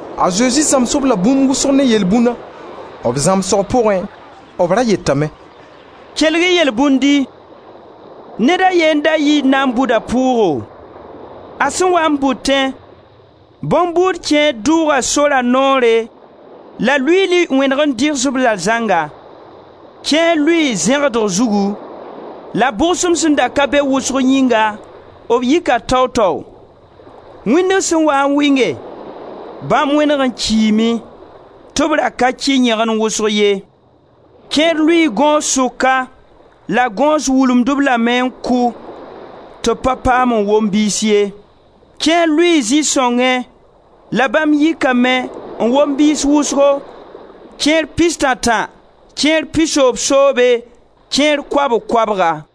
A Zezi zãms-b la bũmb wʋsg ne yelbũna. B zãmsg pʋgẽ b ra yetame: «Kelg-y yelbũndi. Ned a ye n da yii n na n bʋd a pʋʋgo. A sẽn waa n bʋtẽ, bõn-buud kẽer dʋʋga sora noore la luiili wẽneg n dɩgs-b la zãnga. Kẽer lʋɩɩ zẽgdg zugu, la bʋgsem sẽn da ka be wʋsg yĩnga, b yika tao-tao. Wĩndg sẽn waa n wɩnge, bãmb wẽneg n kiime, tɩ b ra ka kɩ yẽgen wʋsg ye. Kẽer lʋɩɩ gõos sʋka la gõos wulumd-b lame n kʋ tɩ b pa paam n wom biis ye. Kẽer lʋɩɩ zĩ-sõngẽ la bãmb yikame n wom biis wʋsgo, kẽer pistã-tã, kẽer pisoobsoobe, kẽer koabg-koabga.»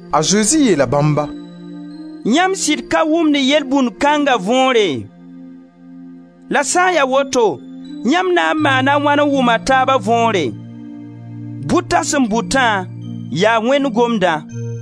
A Zezi yeela bãmba: «Yãmb sɩd ka wʋmd yelbũnd kãnga võore? La sã n ya woto, yãmb na n maana a wãn n wʋm a taaba võore? Bʋta sẽn bʋtã, yaa Wẽnd Gomdã.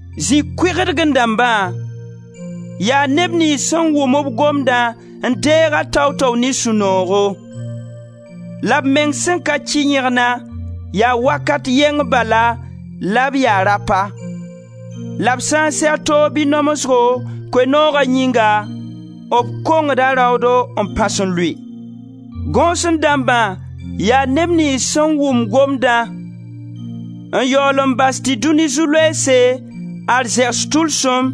Zĩ kʋɩgdgẽ dãmba yaa neb niyns sẽn wʋm-b Gomdã n deeg-a tao-tao ne sũ-noogo. La b meng sẽn ka kɩ yẽgna, yaa wakat yɛng bala la b ya rapa. La b sã n seg toog bɩ namsgo, Koe-nooga yĩnga, b kongda raoodo n pãs n lʋɩ. Gõosẽ dãmbã, yaa neb niyns sẽn wʋm Gomdã n yaool n bas tɩ dũni zu-loeese, arzɛgs tʋlsem,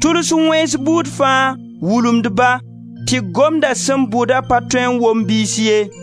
tʋls wẽns buud fãa, wulumd-ba, tɩ Gomda sẽn bʋda pa tõe n wom biis ye.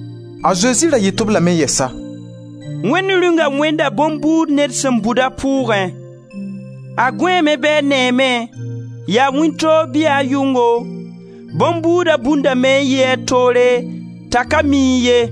A Zezi ra yet-b lame yɛsa: «Wẽnd Rĩunga wẽnda bõn-buud ned sẽn bʋd a pʋʋgẽ. A gõeeme bɩ a neeme, yaa wĩntoog bɩ yaa yʋngo, bõn-buuda bundame n yi a toore t'a ka miẽ ye.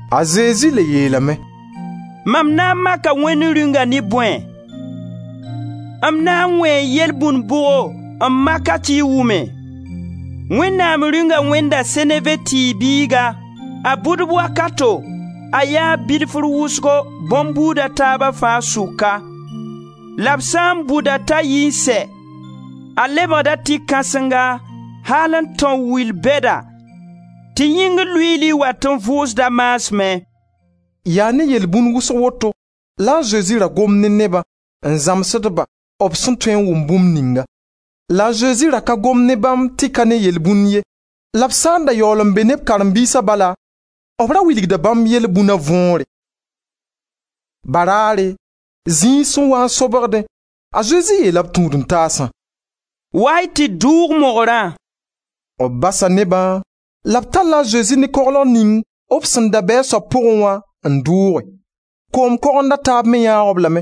A Zezi le yeelame: «Mam na n maka Wẽnd Rĩunga ne bõe? M na n wẽe yelbũnd bʋgo n mak-a tɩ y wʋme? Wẽnnaam Rĩunga wẽnda seneve tɩɩg biiga, a bʋdb wakato, a yaa bilfr wʋsgo bõn-buud a taab fãa sʋka. La b sã n bʋd-a t'a yi n sɛ, a lebgda tɩ kãsenga al n tão wil bɛda tɩ yĩngr luiili wat n vʋʋsd a maasmẽ.» Yaa ne yelbũn wʋsg woto la a Zezi ra gomd ne nebã n zãmsd-ba b sẽn tõe n wʋm bũmb ninga. La a Zezi ra ka gomd ne bãmb tɩ ka ne yelbũn ye la b sã n da yaool n be ne b karen-biisa bala, b ra wilgda bãmb yelbũna võore. Baraare, zĩig sẽn waa n sobgdẽ, a Zezi yeela b tũud-n-taasã: «Wa-y tɩ d dʋʋg mogrã.» B basa nebã la b talla a Zezi ne koglg ning b sẽn da be a soab pʋgẽ wã n dʋʋge. Koom kogend a taab me yãag-b lame.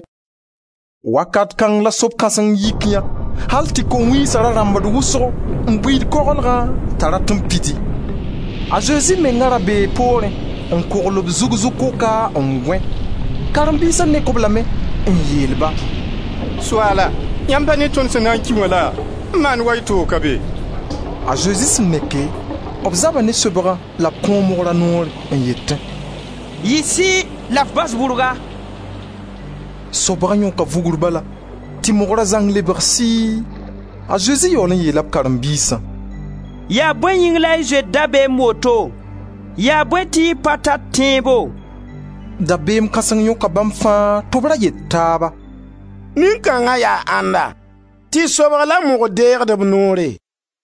Wakat kãng la sob-kãseng yik yã al tɩ ko-wiisa da rãmbd wʋsgo n buiid koglgã t'a rat n pidi. A Zezi menga ra bee poorẽ n kʋgl b zug zu-kʋka n gõe; karen-biisa nek-b lame n yeel-ba: «Soaala, yãmb pa ne tõnd sẽn na n ki wã la, n maand wa y toog ka be?» A Zezi sẽn neke, b zaba ne sobgã la b kõo mogra noor n yetẽ: «Yɩ sɩɩ la f bas bʋrga!» Sobga yõka vugr bala tɩ mogra zãng lebg sɩɩ. A Zezi yaool n yeela b karen-biisã: «Yaa bõe yĩng la y zoet dabeem woto? Yaa bõe tɩ y pa tar tẽebo?» Dabeem kãseng yõka bãmb fãa tɩ b ra yet taaba: «Nin-kãnga yaa Ãnda tɩ sobg la mogr deegd b noore?»